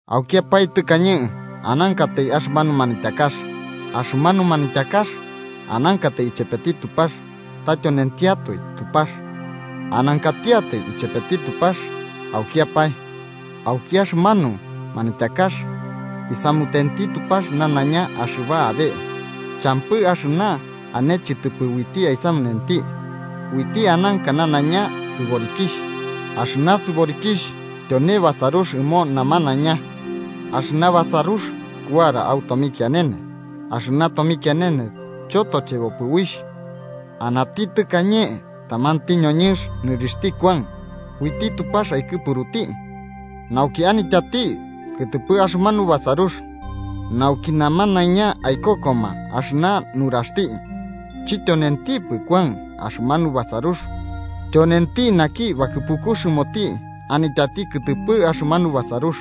Aukiapae tɨkañe anankatai axɨmanu Manityakax. Axɨmanu Manityakax anankatai ichepeti Tupax ta tyonentiatoe Tupax. Anankatiatai ichepeti Tupax aukiapae. Auki axɨmanu manityakax, isamutenti Tupax nanaiña axɨba abe. Champɨ axɨna ane chɨtɨpɨ uiti aisamunenti. Uiti ananka nanaiña sɨborikixh, axɨna sɨborikixh tyone basarux ɨmo namanaiña. Axɨna basarux kuara au tomikianene, axɨna tomikianene chotochebopɨ uixh. Anati tɨkañe tamanti ñoñɨnx nɨrixhti Kuan, uiti Tupax aikɨpuruti nauki anityati kɨtɨpɨ axɨmanu basarux, nauki namanaiña aikokoma axɨna nuraxti. Chityonentipɨ Kuan axɨmanu basarux, tyonenti naki bakɨpukux ɨmoti anityati kɨtɨpɨ axɨmanu basarux.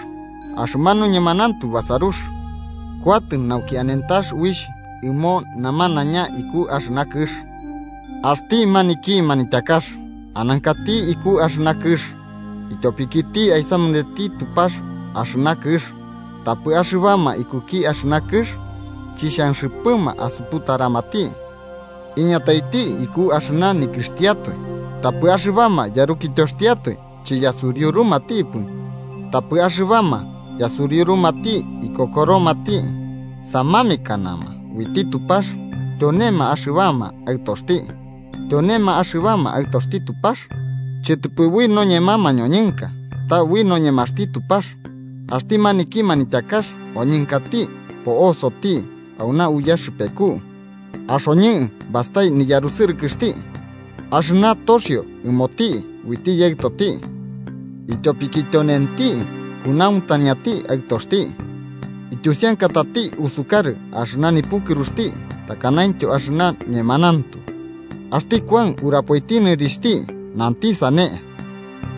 Axɨmanu ñemanauntu basarux kuatɨ nauki anentax uixh ɨmo namanaiña iku axɨna kɨx. Axti maniki Manityakax anankati iku axɨna kɨx. Ityopikiti aisamunenti Tupax axɨna kɨx, tapɨ axɨbama ikuki axɨna kɨx chixhanxɨpɨma asuputaramati. Iñataiti iku axɨna nikɨxtiatoe, tapɨ axɨbama yarukityoxtiatoe chiyasuriurumatipɨ. Tapɨ axɨbama yasuriurumati ikokoromati, samamekanama uiti Tupax tyonema axɨbama aɨtoxti. Tyonema axɨbama aɨtoxti Tupax, chɨtɨpɨ ui noñema mañoñɨnka, ta ui noñemaxti Tupax. Axti maniki Manityakax oñɨnkati po'osoti auna uyaxɨpeku. Axoñɨ bastai niyarusɨrɨkɨxti, axɨna toxio ɨmoti uiti Yaɨtoti, ityopiki tyonenti kunauntañati Aɨtoxti, ityusiankatati usukarɨ axɨna nipukɨruxti takanaintyo axɨna ñemanauntu. Axti Kuan urapoiti nɨrixhti, nanti sane: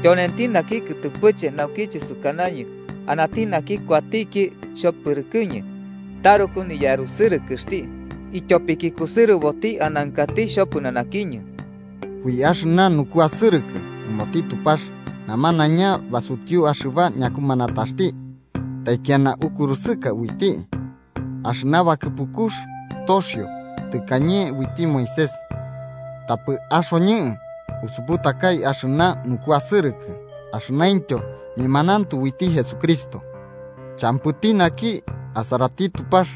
“Tyonenti naki kɨtɨpɨche naukiche sukanañɨ anati naki kuatiki xhopɨrɨkɨñɨ taruku niyarusɨrɨkɨxti, ityopiki kusɨrɨboti anankati xhopɨnanakiñɨ.” Ui axɨna nukuasɨrɨkɨ ɨmoti Tupax namanaiña basutiu axɨba ñakumanataxti taikiana ukurusɨka uiti. Axɨna bakɨpukux toxio tɨkañe uiti Moisés, tapɨ axoñɨ usuputakai axɨna nukuasɨrɨkɨ axɨnaintyo ñemanauntu uiti Jesucristo. Champɨti naki asarati Tupax.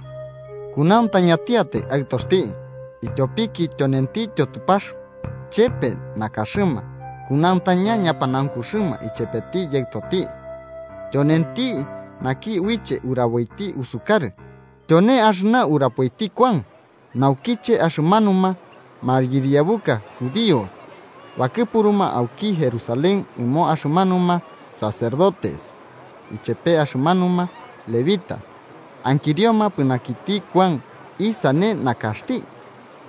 Kunauntañatiatai Aɨtoxti, ityopiki tyonentityo Tupax chepe nakaxɨma kunauntaña ñapanaukuxɨma ichepeti Yaɨtoti, tyonenti naki uiche uraboiti usukarɨ. Tyone axɨna urapoiti Kuan, naukiche axɨmanuma mayɨriabuka judíos bakɨpuruma auki Jerusalén ɨmo axɨmanuma sacerdotes ichepe axɨmanuma levitas ankirioma pɨnanakiti Kuan isane nakaxti.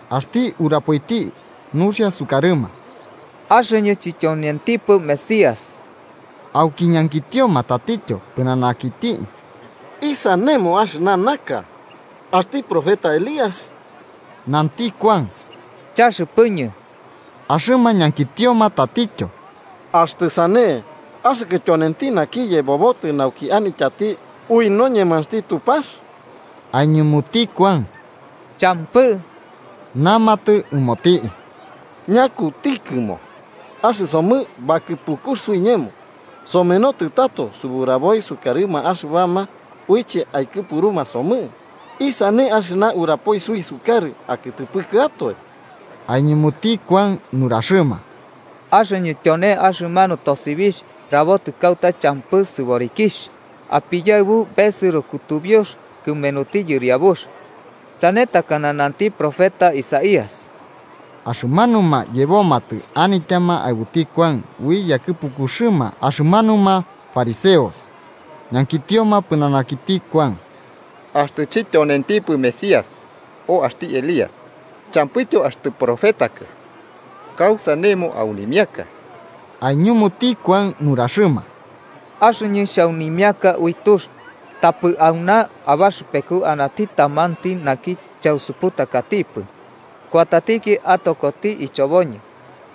Axti urapoiti nuxia sukarɨma: –Axɨñɨ chityonentipɨ Mesías. Auki ñankitioma tatityo pɨnanakiti: –¿Isanemo, axɨna naka? ¿Axti profeta Elías? Nanti Kuan: –Chaxɨpɨñɨ. Axɨma ñankitioma tatityo –Axtɨ sane, ¿axɨkɨ tyonenti naki yebobotɨ nauki anityati ui noñemaxti Tupax? Aiñumuti Kuan: –Champɨ. Namatɨ ɨmoti: –¿Ñakutikɨmo? Axɨsomɨ bakɨpukux suiñemo somenotɨ tato suburaboi sukarɨma axɨbama uiche aikɨpuruma somɨ. ¿Isane axɨna urapoi suisukarɨ akɨtɨpɨkɨatoe? Aiñumuti Kuan nuraxɨma: –Axɨñɨ tyone axɨmanu tosibixh rabotɨ kauta champɨ sɨborikixh: ‘Apiyaɨbu besɨro kutubiux kɨmenuti Yɨriabux’, sane takana nanti profeta Isaías. Axɨmanuma yebomatɨ anityama aɨbuti Kuan ui yakɨpukuxɨma axɨmanuma fariseos, ñankitioma pɨnanakiti Kuan: –Axtɨ chityonentipɨ Mesías, o axti Elías champɨityo axtɨ profetakɨ, ¿kausanemo aunimiaka? Aiñumuti Kuan nuraxɨma: –Axɨñɨ xhaunimiaka ui tux. Tapɨ auna abaxɨpeku anati tamanti naki chausuputakatipɨ kuatatiki atokoti ichoboñɨ.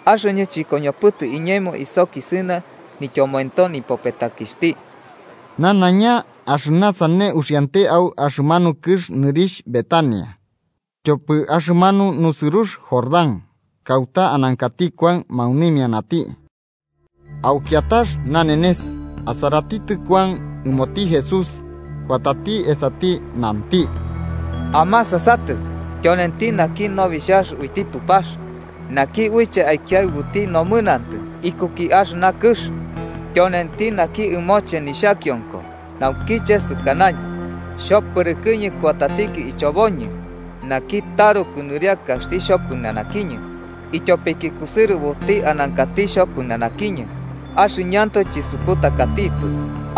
Axɨñɨ chɨkoñopɨtɨ iñemo isokisɨna nityomoento nipopetakixhti. Nanaiña axɨna sane uxiante au axɨmanu kɨx nɨrixh Betania, tyopɨ axɨmanu nusɨrux Jordán, kauta anankati Kuan maunimianati. Au kiatax nanenes, asaratitɨ Kuan ɨmoti Jesús, kuatati esati, nanti: “¡Amasasatɨ, tyonenti naki Nobixhax uiti Tupax, naki uiche aikiaɨbuti nomɨnantɨ ikuki axɨna kɨx! Tyonenti naki ɨmoche nixhakionko naukiche sukanañɨ: ‘Xhopɨrɨkɨñɨ kuatatiki ichoboñɨ naki taruku nɨriakaxti xhopɨnanakiñɨ, ityopiki kusɨrɨboti anankati xhopɨnanakiñɨ.’ Axɨñɨantoe chisuputakatipɨ.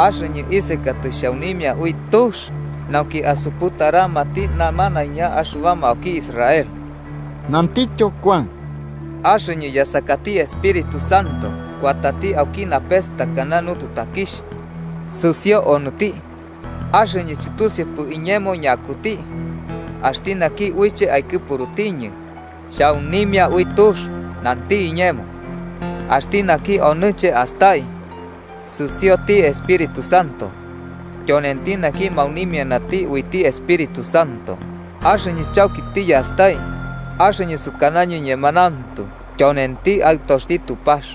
Axɨñɨ isekatɨ xhaunimia ui tux nauki asuputaramati namanaiña axɨbama auki Israel. Nantityo Kuan: “Axɨñɨ yasakati Espíritu Santo kuatati auki napes takana nututakixh, sɨsio onɨti. Axɨñɨ chɨtusiupɨ iñemo ñakuti. Axti naki uiche aikɨpuruñɨ xhaunimia ui tux, nanti iñemo: ‘Axti naki onɨche astai sɨsioti Espíritu Santo, tyonenti naki maunimiana uiti Espíritu Santo.’ Axɨñɨ chauki tiyastai, axɨñɨ sukanañɨ ñemanauntu tyonenti Aɨtoxti Tupax.”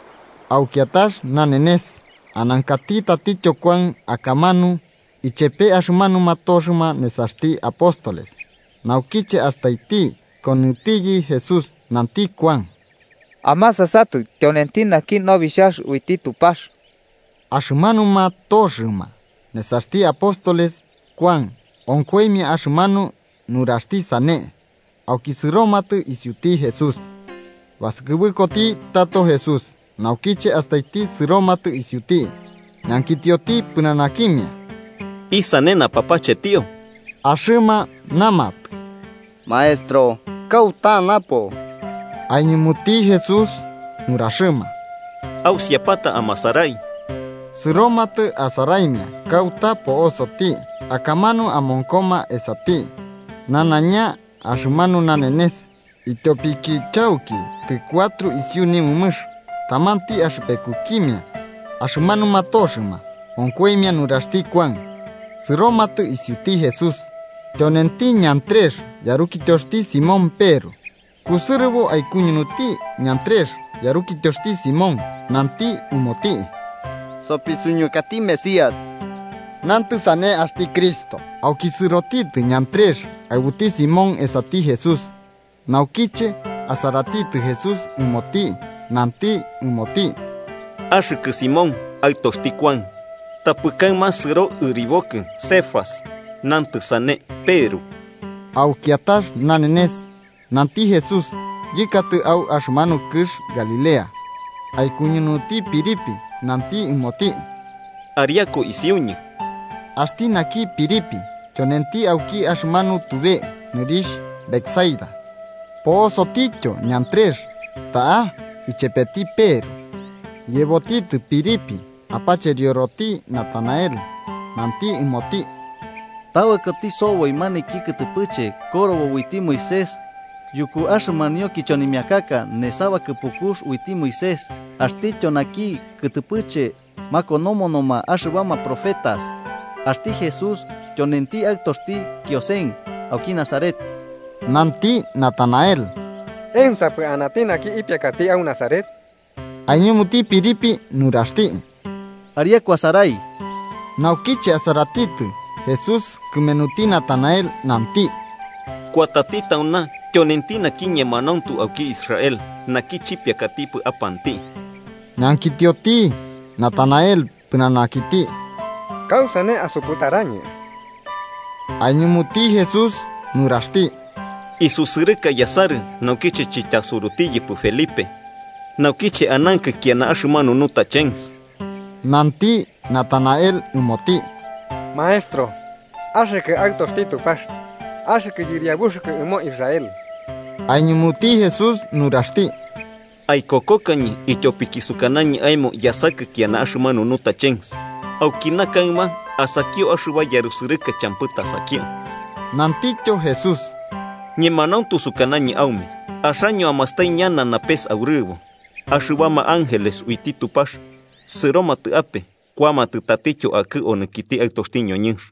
Au kiatax nanenes, anankati tatityo Kuan akamanu ichepe axɨmanuma toxɨma nesaxti apóstoles. Naukiche astaiti ikonɨtiyɨ Jesús, nanti Kuan: –¡Amasasatɨ, tyonenti naki Nobixhax uiti Tupax! Axɨmanuma toxɨma nesaxti apóstoles Kuan onkoimia axɨmanu nuraxti sane, auki sɨromatɨ isiuti Jesús. Basɨkɨbɨkoti tato Jesús, naukiche astaiti sɨromatɨ isiuti ñankitioti pɨnanakimia: –¿Isane napapachetio? Axɨma namatɨ: –Maestro, ¿kauta napo? Aiñumuti Jesús nuraxɨma: –Ausiapata amasarai. Sɨromatɨ, asaraimia kauta po'osoti, akamanu amonkoma esati nanaiña axɨmanu nanenes, ityopiki chauki tɨcuatro isiu nimɨmɨx. Tamanti axɨpekukimia axɨmanuma toxɨma onkoimia nuraxti Kuan sɨromatɨ isiuti Jesús, tyonenti Andrés yarukityoxti Simón Peru. Kusɨrɨbo aikuñunuti Andrés yarukityoxtiatoe Simón, nanti ɨmoti: –Sopisuñukati Mesías (nantɨ sane: axti Cristo) Auki sɨrotitɨ Andrés aɨbuti Simón esati Jesús. Naukiche asaratitɨ Jesús ɨmoti, nanti ɨmoti: –Axɨkɨ Simón, aɨtoxti Kuan, tapɨ kaɨma sɨro ɨribokɨ Cefas (nantɨ sane: Peru). Au kiatax nanenes, nanti Jesús yɨkatɨ au axɨmanu kɨx Galilea. Aikuñunuti Felipe, nanti ɨmoti: –Ariaku isiuñɨ. Axti naki Felipe tyonenti auki axɨmanu tube nɨrixh Betsaida, po'osotityo Andrés ta'a ichepeti Peru. Yebotitɨ Felipe apacherioroti Natanael, nanti ɨmoti: –Tabɨkoti soboi maniki kɨtɨpɨche korobo uiti Moisés yuku axɨmanio kichonimiakaka nesa bakɨpukux uiti Moisés, axtityo naki kɨtɨpɨche makonomonoma axɨbama profetas. Axti Jesús, tyonenti aɨtoxti Kiosen, auki Nazaret. Nanti Natanael: –¿Ensapɨ anati naki ipiakati au Nazaret? Aiñumuti Felipe nuraxti: –Ariaku asarai. Naukiche asaratitɨ Jesús kɨmenuti Natanael, nanti: –Kuatati tauna tyonenti naki ñemanauntu auki Israel, naki chipiakatipɨ apanti. Ñankitioti Natanael pɨnanakiti: –¿Kausane asuputarañɨ? Aiñumuti Jesús nuraxti: –Isusɨrɨka yasarɨ naukiche chityasurutiyɨkipɨ Felipe, naukiche anankɨ kiana axɨmanu nutachens. Nanti Natanael ɨmoti: –Maestro, ¡axɨkɨ Aɨtoxti Tupax, axɨkɨ yɨriabuxɨkɨ ɨmo Israel! Aiñumuti Jesús nuraxti: –¿Aikokokañɨ ityopiki sukanañɨ aemo yasakɨ kiana axɨmanu nutachens? Aukina kaɨma asakio axɨba yarusɨrɨka champɨ tasakio. Nantityo Jesús: –Ñemanauntu sukanañɨ aume axaño amastai ñana napes aurɨbo, axɨbama ángeles uiti Tupax sɨromatɨ ape kuamatɨ tatityo akɨ onɨkiti Aɨtoti ñoñɨnx.